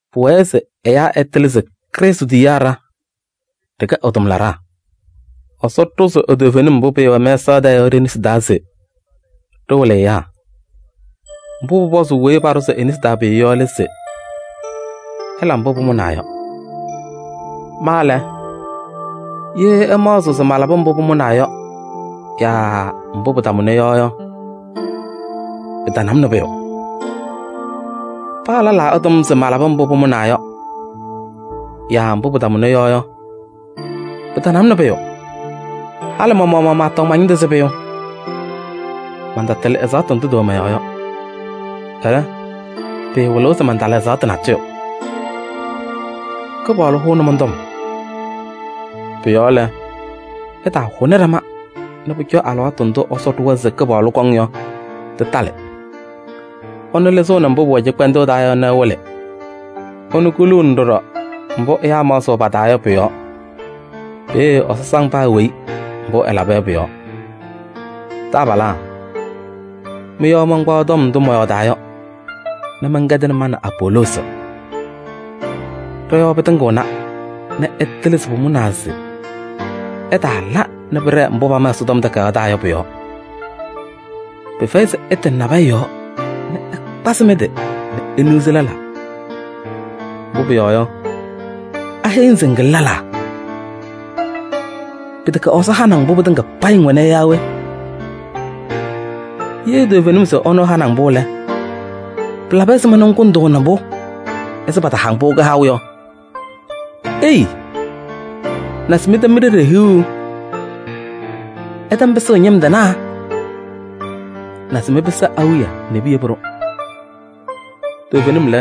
Pʋwɛɛ se ɛyaa ɛtɩlɩ se Krɩstʋ tiyiyaa ɖa, ɖɩkɛ ɛ-tʋmlaɖaa. Ɛsɔ ɖʋzɩ e-toovenim mbʋ pɩɩwɛ mɛsaɣ tɛɛ yɔ ɖe-nesi taa se ɖɩwɩlɩ ɛyaa. Mbʋ pʋpɔzʋʋ weyi paɖʋzɩ e-nesi taa pʋyʋ yɔ lɛ se: ɛla mbʋ pʋmʋnaa yɔ. Ma lɛ, ye ɩmaɣzɩɣ se malabɩ mbʋ pʋmʋnaa yɔ yaa mbʋ pɩtamʋna yɔ yɔ, pɩtana-m nɛ pʋyʋ. Paa lɛlaa ɛtɔm se malabɩ mbʋ pʋmʋnaa yɔ yaa mbʋ pɩtamʋna yɔ yɔ, pɩtana-m nɛ pʋyʋ. Halɩ ma-maɣmaɣ maatɔŋ ma-ñɩndʋ se pʋyʋ. Mantatɩlɩ ɛzaɣtʋ ndʋ tɩwɛ mɔ-yɔɔ yɔ. Ɛlɛ, pɩɩwɩlɩɣ se mantala ɛzaɣtʋ natʋyʋ. Kɩpaɣlʋ hʋʋnɩ mɔn-tɔm. Pʋ-yɔɔ lɛ, ɩtaahʋnɩ ɖama nɛ pʋcɔ alɩwaatʋ ndʋ Ɛsɔ ɖʋwa se Kɩpaɣlʋ kɔŋ yɔ, tɩtalɩ. Ɛnʋ lɩzɩɣnɩ mbʋ pʋwɛ cɩkpɛndʋʋ taa yɔ nɛ ɛwɩlɩ. Ɛnʋ kuluuni ɖɔɖɔ mbʋ ɛyaa maɣzɩɣ pa-taa yɔ pʋ-yɔɔ. Peeye Ɛsɔ saŋ paa weyi mbʋ ɛlaba yɔ pʋ-yɔɔ. Taabalaa, mɩ-yɔɔ mankpaɣ tɔm ndʋ mɔyɔɔdaa yɔ nɛ mɛnkɛdɩnɩ ma nɛ Apoloosi. Ɖɔ-yɔɔ pɩtɩŋɩɣna nɛ ɩtɩlɩ se pʋmʋnaa se ɩtaala nɛ pɩɖɛɛ mbʋ pama Ɛsɔtɔm Takayaɣ taa yɔ pʋ-yɔɔ. Pɩfɛyɩ se ɩtɩnɩ nabɛyɛ yɔɔ nɛ ɩkpazɩ mɩ-tɩ nɛ iniɣzi lɛlaa. Mbʋ pʋyɔɔ yɔ, aheyi-ŋ se ŋkɩlɩ lɛlaa? Pɩtɛkɛ Ɛsɔ hanɩ-ŋ mbʋ pɩtɩŋa payɩ ŋwɛna yɔ yaa we? Ye toovenim se ɛnʋ ɛhanɩ-ŋ-pʋ lɛ, pɩlabɩ ɛzɩma ŋkʋndʋʋnɩ-pʋ ɛzɩ pataha-ŋ-pʋ kɩhaʋ yɔ? Ei! Naze mɩtɛm mi-ɖeɖe hiɣu! Ɩtɛm pɩsʋʋ ñɩm tɩnaa! Naze mɩpɩsɩ awiya nɛ piyebi-ɖʋ! Toovenim lɛ,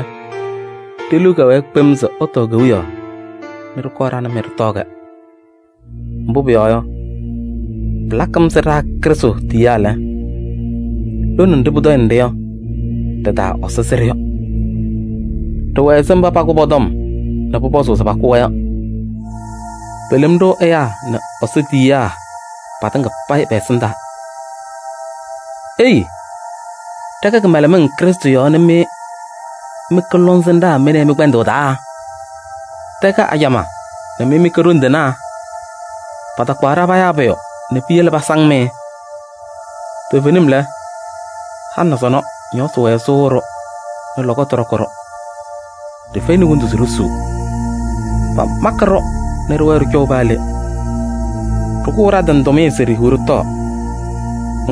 ɖe-liu kɛwɛɛ kpem se ɩtɔɔ kewiyaɣ nɛ ɖɩkɔɔ ɖa nɛ mɩ ɖɩtɔɔ-kɛ. Mbʋ pʋyɔɔ yɔ, pɩlakɩ-m ɛzɩ ɖa Krɩstʋ tiyiyaa lɛ, lone nɖɩ pʋtɔyɩnɩ-ɖɩ yɔ, ɖɩ-taa Ɛsɔ sɩ-ɖʋ yɔ. Ɖɩwɛ ɛzɩ mba pakʋ pɔ-tɔm nɛ pʋpɔzʋʋ se pakʋ-wɛ yɔ. Pelem-ɖʋ ɛyaa nɛ Ɛsɔ tiyiyaa patɩŋa payɩ pɛ-ɛsɩndaa. Ei! Ɖɛkɛ kɩmɛlɛmɩŋ Krɩstʋ yɔɔ nɛ mɩ mɩkɛ lɔŋsɩnɖaa mɩ nɛ ɩ mɩ-kpɛndʋʋ taa! Ɖɛkɛ ajamaa nɛ mɩkɛ ɖoŋ tɩnaa! Patakpaɣ-ɖa payaa pʋyʋ nɛ piyele pasaŋ-mɩ! Toovenim lɛ, halɩ nɛ sɔnɔ, ñɔɔsɩ wɛɛ sɩwɩɣ-ɖʋ nɛ lɔkɔtʋ ñɔɖɔkɩ-ɖʋ. Ɖɩfɛyɩnɩ wondu se ɖisuu. Pamakɩ-ɖʋ nɛ ɖɩwɛɛ ɖɩcɔʋ paa le. Ɖɩkʋʋ ɖa-tɩ nɛ tʋmɩyɛ se ɖihiɣ ɖɩtɔɔ.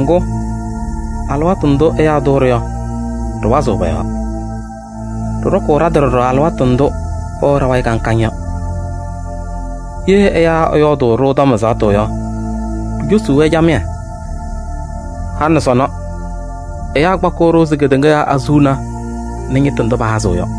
Ŋgʋ, alɩwaatʋ ndʋ ɛyaa tʋʋ-ɖʋ yɔ, ɖɩwazɩɣ pɔ-yɔɔ. Ɖɩɖɔkʋʋ ɖa-tɩ ɖɔɖɔ alɩwaatʋ ndʋ pɛwɛɣ ɖa-wayɩ kaŋ kaŋ yɔ. Ye ɛyaa ɛyɔɔdʋʋ-ɖʋ tɔm ɛzaɣtʋ yɔ, ɖicosuu-wɛ camɩyɛ. Halɩ nɛ sɔnɔ, ɛyaa kpakɩɣ-ɖʋ ɛzɩ kedeŋa yɔɔ azuluma nɛ ñɩtʋ ndʋ pahazɩɣ yɔ.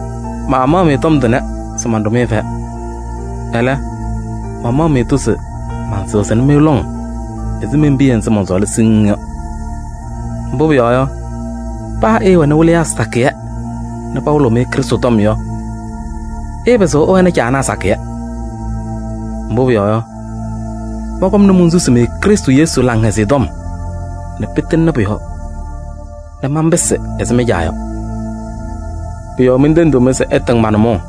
Maamaɣ-mɩ tɔm tʋnɛ se manɖʋ-mɩ fɛyɛ. Ɛlɛ, mamaɣ-mɩ-tʋ se mansɩɣzɩ-mɩ lɔŋ ɛzɩ men-piya nzɩ mɔnsɔɔlaa siŋŋ yɔ. Mbʋ pʋyɔɔ yɔ, paa ɩɩwɛnɩ wɩlɩyaa sakɩyɛ nɛ pawɩlɩɣ-mɩ Krɩstʋ tɔm yɔ, ɩɩpɩzɩɣ ɩwɛnɩ caanaa sakɩyɛ. Mbʋ pʋyɔɔ yɔ, mɔnkɔmnɩ monsusi-mɩ Krɩstʋ Yesu Laŋhɛzɩyɛ Tɔm nɛ pɩtɩŋnɩ pʋ-yɔɔ nɛ manpɩsɩ ɛzɩ mɩ-caa yɔ. Pʋ-yɔɔ mentendiɣ-mɩ se ɩtɩŋ ma-nʋmɔʋ.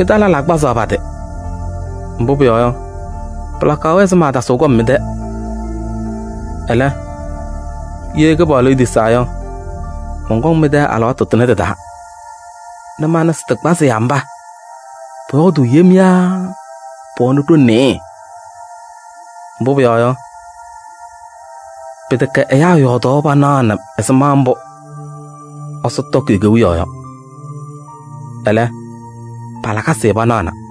Mɩ-taa lɛlaa kpazaɣ pa-tɩ, mbʋ pʋyɔɔ yɔ, pɩlakaɣ-wɛ se maatasɩɣ kɔm mɩ-tɛ. Ɛlɛ, ye Kɩpaɣlʋ etisaa yɔ, mɔnkɔŋ mɩ-tɛ alɩwaatʋ tʋnɛ tɩ-taa nɛ mana se tɩkpazɩyaa mba pɔyɔɔdʋʋ yem yaa pɛwɛnɩ ɖoŋ nɩɩyɩ. Mbʋ pʋyɔɔ yɔ, pɩtɛkɛ ɛyaa yɔɔdaɣ panaɣnɩ ɛzɩma mbʋ Ɛsɔ tɔkɩ e-Kewiyaɣ yɔ. Ɛlɛ, pa-lakasɩ panaɣna.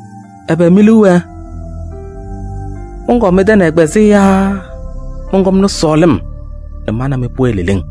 Ɛbɛ mi-liu wɛɛ: mɔnkɔɔ mɩ-tɛ nɛ ɛgbazɩyɛ yaa mɔnkɔmnɩ sɔɔlɩm nɛ ma nɛ mɩ pʋwɛɛ leleŋ?